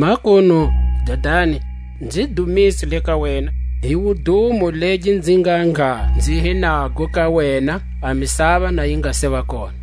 Makunu, Dadani, nzi dumise le ka wena hi wudumo legi nzi ngha nga nzi hi nago ka wena, a misava na yi nga seva kona.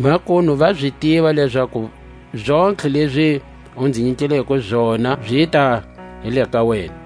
Makunu va zi tiva lezaku zontlhe lezi u nzi nyikileko zona zita hi le ka wena.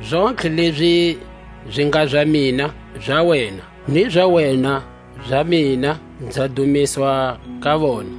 Zontlhe lezi zi nga za mina za wena, ni za wena za mina; nza dumiswa ka vona.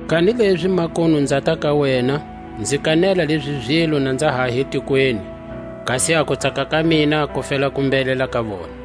Kanilezi makunu nzata ka wena; nzi kanela lezi zilo na nza ha hi tikweni, kasi a kutsaka ka mina ku fela ku mbhelela ka vona.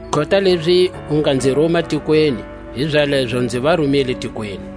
Kota lezi u nga nzi ruma tikweni, hizalezo nzi va rumile tikweni.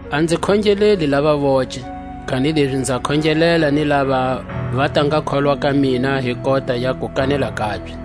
A nzi khongeleli lava voce, kanilezi nza khongelela ni lava va ta nga kholwa ka mina hi kota ya kukanela kabye;